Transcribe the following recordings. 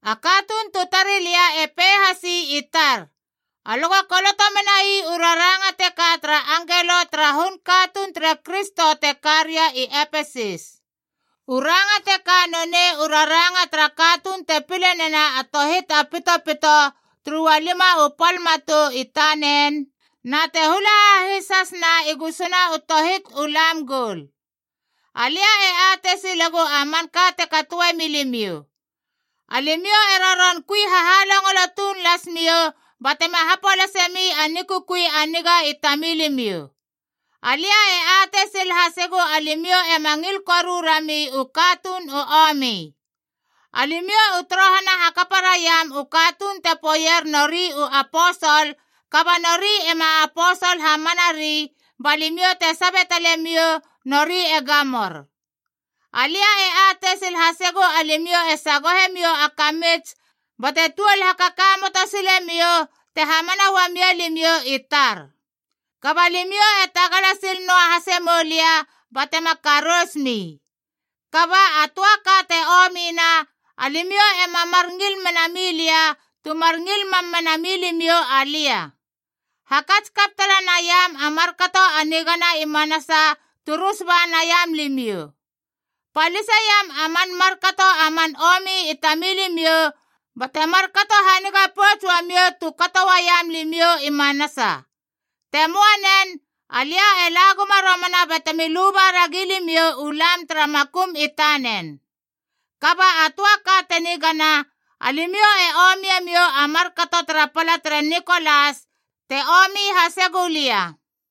A katuun tu tari lia e pei hasi i tar, “Alö go koloto menai u raranga teka tara angelo tara hun katuun tere Kristo te ka ria i Epesis: “U ranga teka nonei u raranga tara katuun te pile nena a tohit a pitopito turu ualima u pal matou i tanen, na te hula hahis hasna i gusuna u tohit u lam goul. Alia e atei silegu a manka te katoe milimiou. Alimiou e roron kui hahalongolo tuun las miou batema hapolase mi a nikukui a niga i tamilimiou. Alia e atei sil hasegu alimiou ema ngil koru rami u katuun u omi. Alimiou u torohana hakapa raiam u katuun te poeier nori u aposol kaba nori ema aposol hamanari, ba limiou te sabe tale miou nori e gamor. Alia e atei sil hasegu alimiou e sagohe miou a kamits bate tuol hakakamoto sile miou te hamana uamia limiou i tar. Kaba limiou e tagala sil noa hase moulia batema karous mi. Kaba a töa ka te omina: alimiou ema mar ngil mena milia tu mar ngil mam mena milimiou alia. Hakats kap tala naiam a markato a nigana i manasa tu rus ba naiam limiou. Paliseiam a man markato a man omi i tamilimiou bate markato haniga pouts uamiou tu kato uaiam limiou i manasa. Te möa nen, alia e la guma romana batemi luba ragi limiou u lam tara makum i tanen. Kaba a töa ka te nigana: alimiou e omie miou a markato tara pala tere Nikolas,b te omi hase gulia.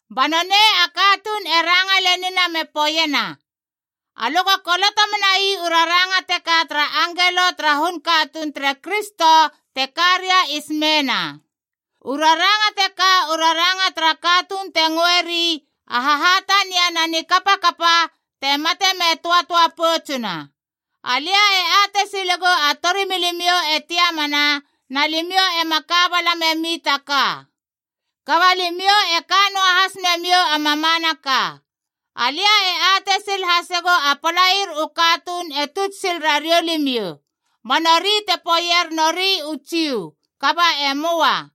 Ba nonei a katuun e ranga lenina me poeiena, “Alö go koloto menai u raranga teka tara angelo tara hun katuun tere Kristo te ka ria i Smeena: “U raranga teka u raranga tara katuun te ngöeri a Hahatania na ni Kapakapa, te mate me töatöa poutsuna. Alia e atei silegu a torimilimiou e tiamana, na limiou ema ka bala memi ta ka. Kaba limiou e ka noa has memiou a mamanaka.c Alia e atei sil hasegu a palair u katuun e tuts sil rariou limiou. Ba nori te poeier nori u Jiu, kaba e möa.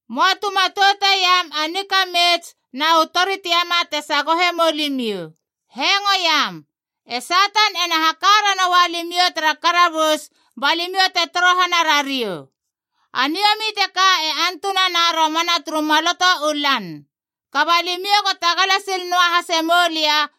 Möa tu matouteiam a nikamits na u tori tiama te sagohe mou limiou. Hengoiam. E Satan ena haka ranoua limiou tara karabus ba limiou te torohana rariou. A niomi teka e antunana romana turu maloto u lan. Kaba limiou go tagala sil noa hase moulia,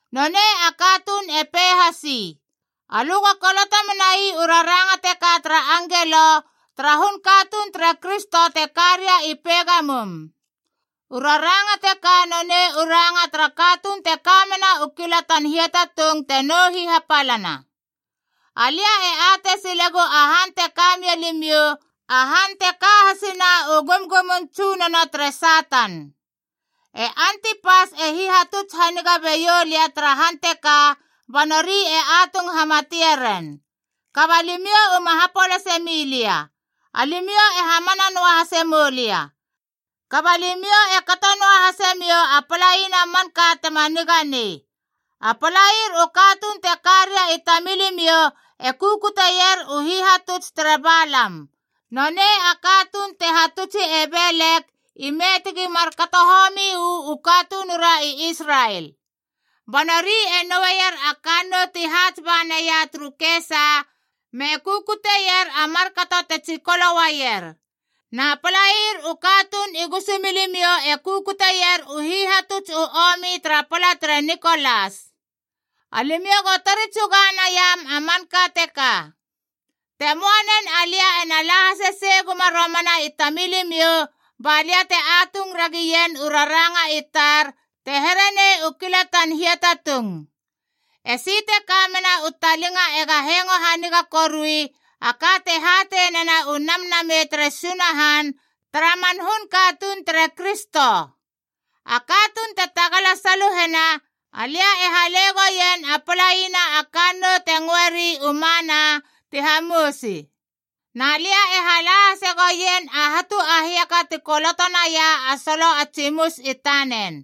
Nonei a katuun e pei hasi, “Alö go koloto menai u raranga teka tara angelo tara hun katuun tere Kristo te ka ria i Pegamum: “U raranga teka nonei u ranga tara katuun te ka mena u kilatan hiatatung te nou hihapalana. Alia e atei silegu a han te ka mia limiou, a han te ka hasina u gumgumun tsunono tere Satan. E Antipas e hihatuts haniga beiou lia tara han teka, ba nori e atung hamatie ren. Kaba limiou uma hapolase mi lia. Alimiou e hamana noa hase moulia. “Kaba limiou e kato noahase miou a palaina manka tema niga nei: a palair u katuun te ka ria i tamilimiou e kukuteier u hihatuts tere Balam. Nonei a katuun te hatutsi e Belek ime tegi markato homi uu katunura i Israel. Ba nori e noueier a kannou ti haats ba naia turu kesa me kukuteier a markato te tsikolo uaier. Na palair u katuun i gusumilimiou e kukuteier u hihatuts u omi tara pala tere Nikolas. Alimiou go tori tsuga naiam a manka teka. Te möa nen, alia ena la hasesei guma romana i tamilimiou ba lia te atung ragien u raranga i tar te here nei u kilatan hiatatung. “Esi te ka mena u talinga ega hengo haniga korui a ka te hatei nena u Namnamei tere Sunahan tara man hun katuun tere Kristo. “A katuun te tagala saluhena, alia e hale goien a palaina a kannou te ngöeri u Mana ti hamousi.g Na lia e hala hase goien a hatu a hiaka ti koloto naia a solo a tsimus i tanen.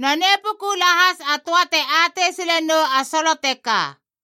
Nonei puku lahas a töa te atei sile nou a solo teka.”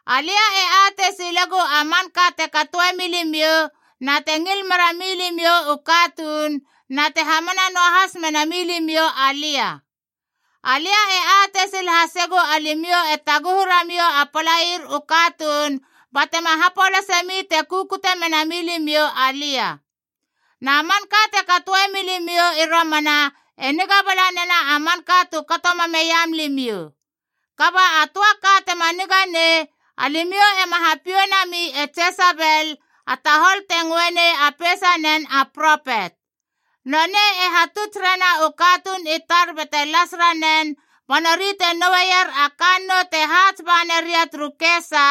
Alia e atei silegu a manka te katoe milimiou, na te ngil mera milimiou u katuun, na te hamana noahas mena milimiou alia. Alia e atei sil hasegu alimiou e taguhu ramiou a palair u katuun batema hapolase mi te kukute mena milimiou alia. Na manka te katoe milimiou i romana e niga bala nena a manka tu kato mameiam limiou. “Kaba a töa ka tema niganei: alimiou ema hapiou nami e Jesebel, a tahol te ngöe nei a peisanen a propet. Nonei e hatuts rena u katuun i tar bate las ranen, ba nori te noueier a kannou te haats ba naria turu kesa,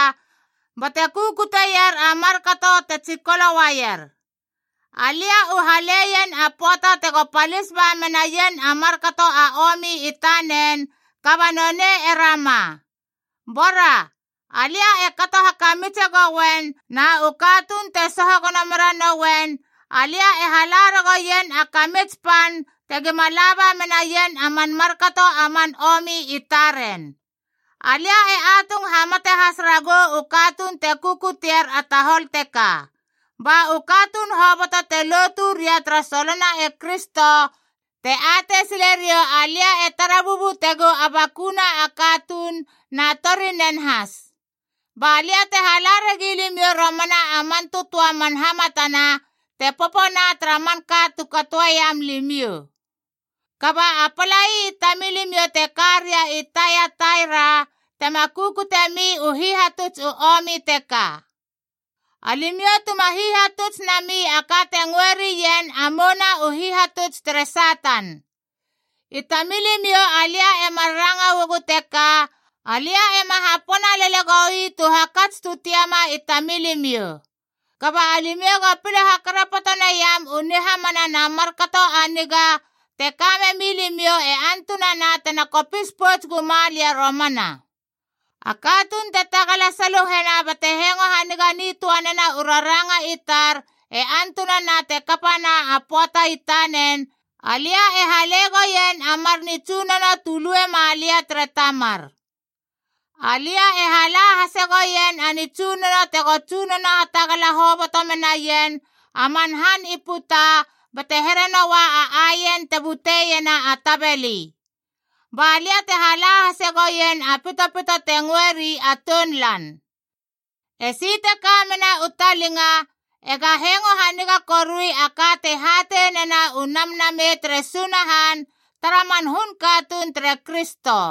bate kukuteier a markato te tsikolo uaier. Alia u haleien a pöata tego palis ba menaien a markato a omi i tanen, kaba nonei e rama. Bora, alia e kato hakamitse goien na u katuun te soho gono meranouen, alia e hala ragoien a kamits pan tegima laba menaien a man markato a man omi i taren. Alia e atung hamate has ragou u katuun te kukutier a tahol teka.h Ba u katuun hoboto te lotu ria tara solona e Kristo te atei sile riou alia e tara bubutegu a bakuna a katuun na i torinen has. Ba lia te hala ragi limiou romana a man tötöa u hamatana e popona tara manka tu katoeiam limiou. “Kaba a palai i tamilimiou te karia i Taiataira tema kukutiemi u hihatuts u omi teka. Alimiou tuma hihatuts nami a ka te ngöe rien a mouna u hihatuts tere Satan. I tamilimiou alia e mar ranga uagu teka, alia ema hapona lele goi tu hakats tu tiama i tamilimiou. Kaba alimiou go pile hakarapoto naiam u nihamana na markato a niga te ka memi limiou e antunana tena kopis pouts guma lia romana. “A katuun te tagala saluhena bate hengo haniga nitöa nena u raranga i tar e antunana te kapana a pöata i tanen, alia e hale goien a mar nitsunono tu lue malia tere Tamar. Alia e hala hase goien a nitsunono tego tsunono hatagala hoboto menaien a man han i puta bate here noua a aien te buteiena a tabeli, Ba lia te hala hase goien a pitopito te ngöeri a tounlan.i “Esi te ka mena u talinga ega hengo haniga korui a ka te hatei nena u Namnamei tere Sunahan tara man hun katuun tere Kristo.”